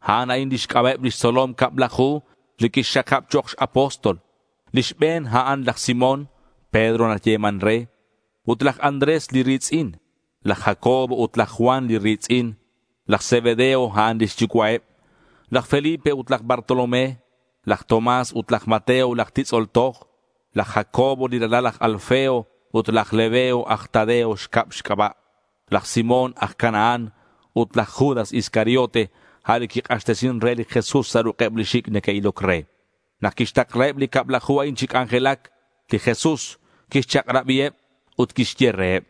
A'an a'in lix c'aba'eb lix tzolom cablaju, li quixxakab chok' x-apóstol: li xbe̱n, a'an laj Simón, Pedro nayeman re; ut laj Andrés li ri̱tz'in; laj Jacobo ut laj Juan li ri̱tz'in. Laj Zebedeo, a'an lix yucua'eb; laj Felipe ut laj Bartolomé; laj Tomás ut laj Mateo laj titz'ol toj; laj Jacobo li ralal laj Alfeo ut laj Lebeo aj Tadeo xcab xc'aba', laj Simón aj Canaán, ut laj Judas Iscariote, a' li quik'axtesin re li Jesús sa' ruk'eb li xic' neque'iloc re. Nak quixtaklaheb li cablaju a'in chi c'anjelac, li Jesús quixchak'rabiheb ut quixye reheb: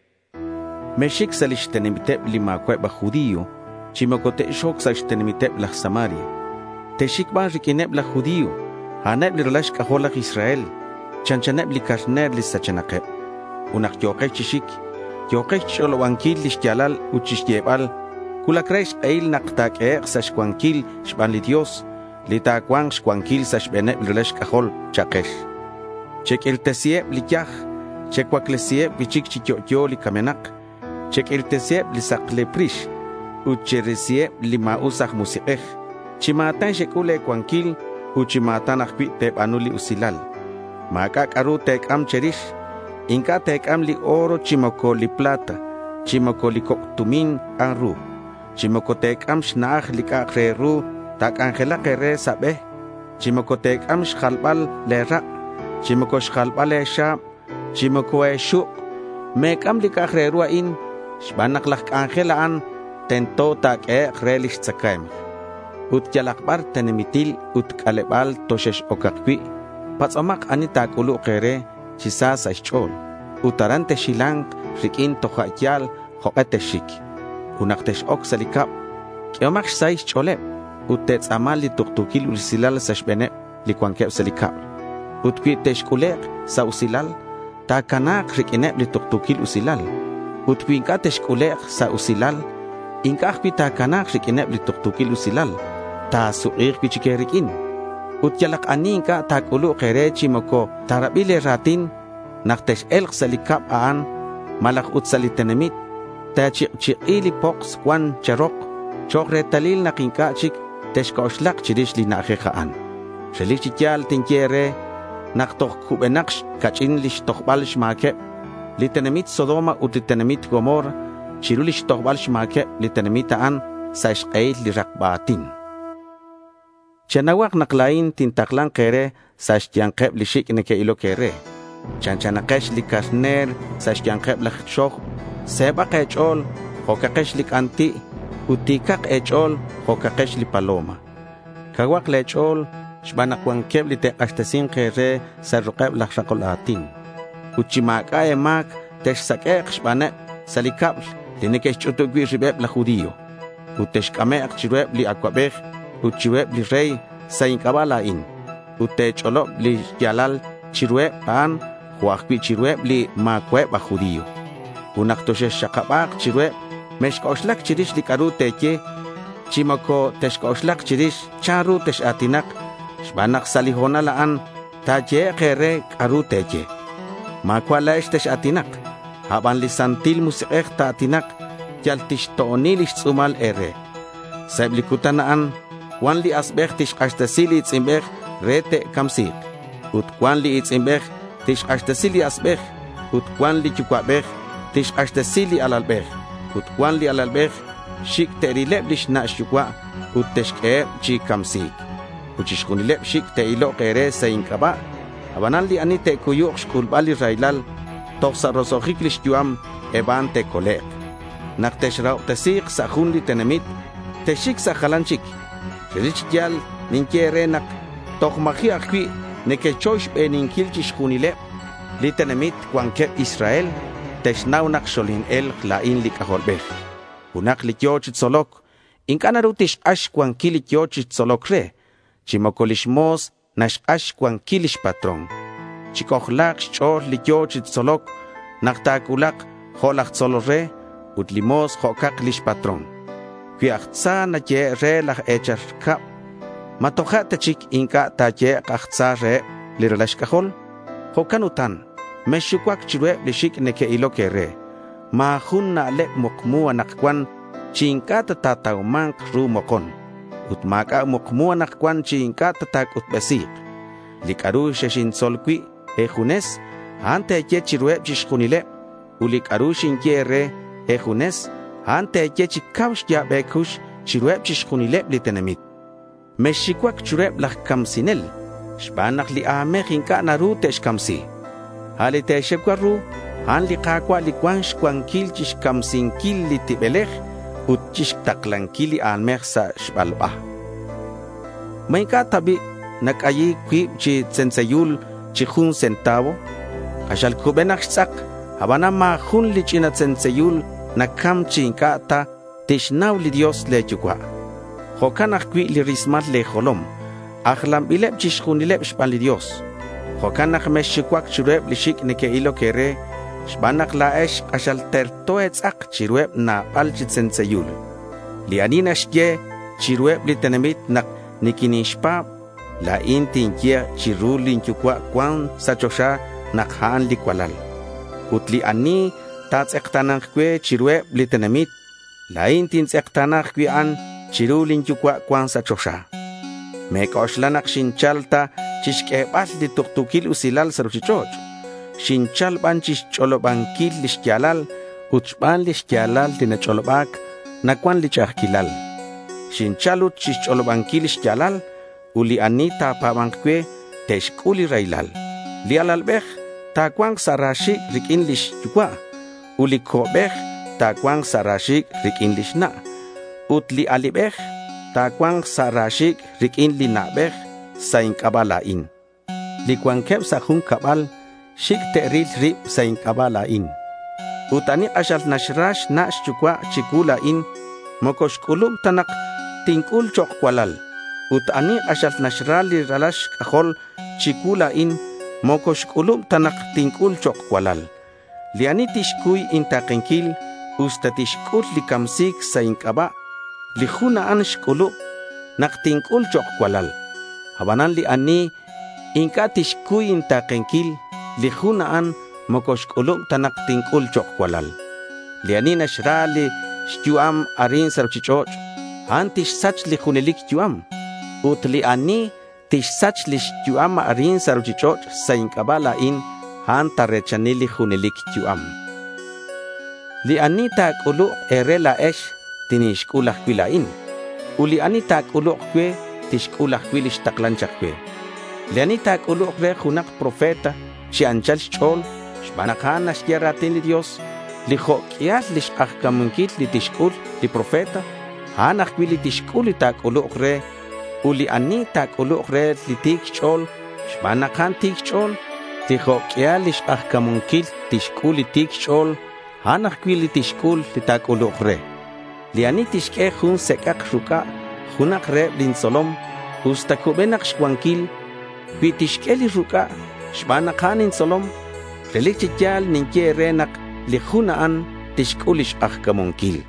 —Mexxic sa' lix tenamiteb li ma̱cua'eb aj judío chi moco tex-oc sa' xtenamiteb aj Samaria. Texxic ban riq'uineb laj judío. A'aneb li ralal xc'ajol laj Israel. Chanchaneb li carner li sachenakeb. Ut nak yo̱kex chi xic, yo̱kex chixch'olobanquil li xya̱lal ut chixyebal, “cuulac re xk'ehil nak ta̱q'uehek' sa' xcuanquil xban li Dios li ta̱cua̱nk xcuanquil sa' xbe̱neb li ralal xc'ajol,” cha'kex. Cheq'uirtesiheb li yaj, checuaclesiheb cui'chic chi yo'yo li camenak. Cheq'uirtesiheb li saklep rix ut cherisiheb li ma̱us aj musik'ej. Chi ma̱tan xec'ul le̱ cuanquil ut chi ma̱tan ajcui' te̱ba̱nu li usilal. Ma̱c'a' c'a'ru te̱c'am che̱rix. Inc'a' te̱c'am li oro chi moco li plata, chi moco li coc' tumin k'an ru. Chi moco te̱c'am xna'aj li c'a'ak re ru ta̱c'anjelak e̱re sa' be, chi moco te̱c'am xjalbal le̱ rak', chi moco xjalbal e̱xa̱b, chi moco e̱xuk'. Me̱c'am li c'a'ak re ru a'in xban nak laj c'anjel, a'an tento nak ta̱q'uehek' re lix tzacae̱mk. Ut yalak bar tenamitil ut c'aleba̱l toxex-ocak cui', patz'omak ani ta̱c'uluk e̱re chi sa sa' xch'o̱l, ut aran texhila̱nk riq'uin toja' ya̱l jok'e texxic. Ut nak tex-oc sa' li cab, q'uehomak xsahil xch'o̱leb ut te̱tz'a̱ma li tuktu̱quil usilal sa' xbe̱neb li cuanqueb sa' li cab. Ut cui texc'ulek' sa' usilal, ta̱cana̱k riq'uineb li tuktu̱quil usilal. Ut cui inc'a' texc'ulek' sa' usilal, inc'a' ajcui' ta̱cana̱k riq'uineb li tuktu̱quil usilal. Ta̱suk'i̱k cui'chic e̱riq'uin. Ut yalak ani inc'a' ta̱c'uluk e̱re chi moco ta̱rabi le̱ ra̱tin, nak tex-e̱lk sa' li cab a'an, malaj ut sa' li tenamit, te̱chik'chik'i li poks cuan che̱rok chok' retalil nak inc'a' chic texc'oxlak chirix li na'ajej a'an. Relic chi ya̱l tinye e̱re nak toj cubenak ca'ch'in lix tojbal xma̱queb li tenamit Sodoma ut li tenamit Gomorra chiru lix tojbal xma̱queb li tenamit a'an sa' xk'ehil li rakba a̱tin. Chenauhak nak la̱in tintakla̱nk e̱re sa' xya̱nkeb li xic' neque'iloc e̱re. Chanchanakex li carner sa' xya̱nkeb laj xoj. Se̱bak e̱ch'o̱l jo'cakex li c'anti' ut ti̱cak e̱ch'o̱l jo'cakex li paloma. Cauhak le̱ ch'o̱l xban nak cuanqueb li te'k'axtesi̱nk e̱re sa' ruk'eb laj rakol a̱tin. Ut chi ma̱c'a' e̱ma̱c texsaq'uek' xbaneb sa' li cab li neque'xch'utub cui' ribeb laj judío. Ut texc'amek' chiruheb li acuabej ut chiruheb li rey sa' inc'aba' la̱in. Ut te̱ch'olob li xya̱lal chiruheb a'an, jo' ajcui' chiruheb li ma̱cua'eb aj judío. Ut nak toxexxakaba̱k chiruheb, mexc'oxlac chirix li c'a'ru te̱ye, chi moco texc'oxlak chirix chanru tex-a̱tinak xban nak sa' li ho̱nal a'an ta̱yehek' e̱re c'a'ru te̱ye. Ma̱cua' la̱ex li tex-a̱tinak. A' ban li Santil Musik'ej ta̱a̱tinak. Yal tixto'oni lix tz'u̱mal e̱re. Sa' eb li cutan a'an, cuan li asbej tixk'axtesi li i̱tz'inbej re ta̱camsi̱k ut cuan li i̱tz'inbej tixk'axtesi li asbej. Ut cuan li yucua'bej tixk'axtesi li alalbej. Ut cuan li alalbej xic' te'rileb lix na' xyucua' ut te'xq'ueheb chi camsi̱c. Ut chixjunileb xic' te'ilok e̱re sa' inc'aba'. Abanan li ani te'cuyuk xc'ulbal li raylal toj sa' roso'jic lix yu'am, eb a'an te'colek'. Nak texrahobtesi̱k sa' jun li tenamit, texxic sa' jalan chic. Relic chi ya̱l ninye e̱re nak toj ma̱ji' ajcui' nequechoy xbeninquil chixjunileb li tenamit cuanqueb Israel te'xnau nak xoline̱lk la̱in li C'ajolbej. Junak li yo̱ chi tzoloc inc'a' naru tixk'ax xcuanquil li yo̱ chi tzoloc re, chi moco li mo̱s naxk'ax xcuanquil lix patrón. Chic'ojla̱k xch'o̱l li yo̱ chi tzoloc nak ta̱cuulak jo' laj tzolol re, ut li mo̱s jo'cak lix patrón. Cui aj tza nayehe' re laj e̱chal cab, ¿ma toja' ta chic inc'a' te'yehek' aj tza reheb li ralal xc'ajol? Jo'can utan mexxucuac chiruheb li xic' neque'iloc e̱re. Ma̱ jun na'leb mukmu anakcuan chi inc'a' ta ta̱tauma̱nk ru mokon, ut ma̱c'a' mukmu anakcuan chi inc'a' ta̱c'utbesi̱k. Li c'a'ru xexintzol cui' e̱junes, a'an te̱ye chiruheb chixjunileb, ut li c'a'ru xinye e̱re e̱junes, a'an te̱ye chi cau xya̱b e̱cux chiruheb chixjunileb li tenamit. Mexxucuac chiruheb laj camsinel xban nak li a̱mej inc'a' naru te'xcamsi. A' li te̱xucua ru, a'an li Ka̱cua' li cuan xcuanquil chixcamsinquil li tibelej ut chixtaklanquil li a̱mej sa' xbalba. ¿Ma inc'a' ta bi' nac'ayi̱c cuib chi tzentzeyul chi jun centavo? K'axal cubenak xtz'ak, abanan ma̱ jun li ch'ina tzentzeyul nacam chi inc'a' ta tixnau li Dios le̱ Yucua'. Jo'can ajcui' li rismal le̱ jolom ajlanbileb chixjunil xban li Dios. Jo'can nak mexxucuac chiruheb li xic' neque'iloc e̱re xban nak la̱ex k'axal terto e̱tz'ak chiruheb nabal chi tzentzeyul. Li ani naxye chiruheb li tenamit nak niquinixpa̱b, la̱in tinye chiru lin Yucua' cuan sa' choxa nak a'an li cualal. Ut li ani ta̱tz'ekta̱na̱nk cue chiruheb li tenamit, la̱in tintz'ekta̱na ajcui' a'an chiru lin Yucua' cuan sa' choxa. Me̱c'oxla nak xinchal ta chixq'uebal li tuktu̱quil usilal sa' ruchich'och'. Xinchal ban chixch'olobanquil li xya̱lal; ut xban li xya̱lal li nach'oloba̱c, nacuan li ch'a'ajquilal. Xinchal ut chixch'olobanquil li xya̱lal ut li ani ta̱pa̱ba̱nk cue, te'xc'ul li raylal. Li alalbej ta̱cua̱nk sa' ra xi̱c' riq'uin lix yucua', ut li co'bej ta̱cua̱nk sa' ra xi̱c' riq'uin lix na', ut li alibej ta̱cua̱nk sa' ra xi̱c' riq'uin li na'bej sa' inc'aba' la̱in. Li cuanqueb sa' jun cabal, xic' te'ril rib sa' inc'aba' la̱in. Ut ani k'axal naxra xna' xyucua' chicuu la̱in, moco xc'ulub ta nak tinc'ul chok' cualal. Ut ani k'axal naxra li ralal xc'ajol chicuu la̱in, moco xc'ulub ta nak tinc'ul chok' cualal. Li ani tixcuy inta̱kenquil usta tixc'ul li camsi̱c sa' inc'aba', li jun a'an xc'ulub nak tinc'ul chok' cualal. Abanan li ani inc'a' tixcuy inta̱kenquil, li jun a'an moco xc'ulub ta nak tinc'ul chok' cualal. Li ani naxra lix yu'am arin sa' ruchich'och', a'an tixsach li junelic yu'am. Ut li ani tixsach lix yu'am arin sa' ruchich'och' sa' inc'aba' la̱in, a'an ta̱re̱chani li junelic yu'am. Li ani ta̱c'uluk e̱re la̱ex, tinixc'ul ajcui' la̱in. Ut li ani ta̱c'uluk cue, tixc'ul ajcui' li xtaklan chak cue. Li ani ta̱c'uluk re junak profeta chi anchal xch'o̱l xban nak a'an naxye ra̱tin li Dios, li jo' q'uial lix k'ajca̱munquil li tixc'ul li profeta, a'an ajcui' li tixc'ul li ta̱c'uluk re. Ut li ani ta̱c'uluk re li ti̱c xch'o̱l xban nak a'an ti̱c xch'o̱l, li jo' q'uial lix k'ajca̱munquil li tixc'ul li ti̱c xch'o̱l, a'an ajcui' li tixc'ul li ta̱c'uluk re. Li ani tixq'ue jun sec'ak ruc'a junak reheb lin tzolom usta cubenak xcuanquil, cui tixq'ue li ruc'a xban nak a'an intzolom, relic chi ya̱l ninye e̱re nak li jun a'an tixc'ul lix k'ajca̱munquil.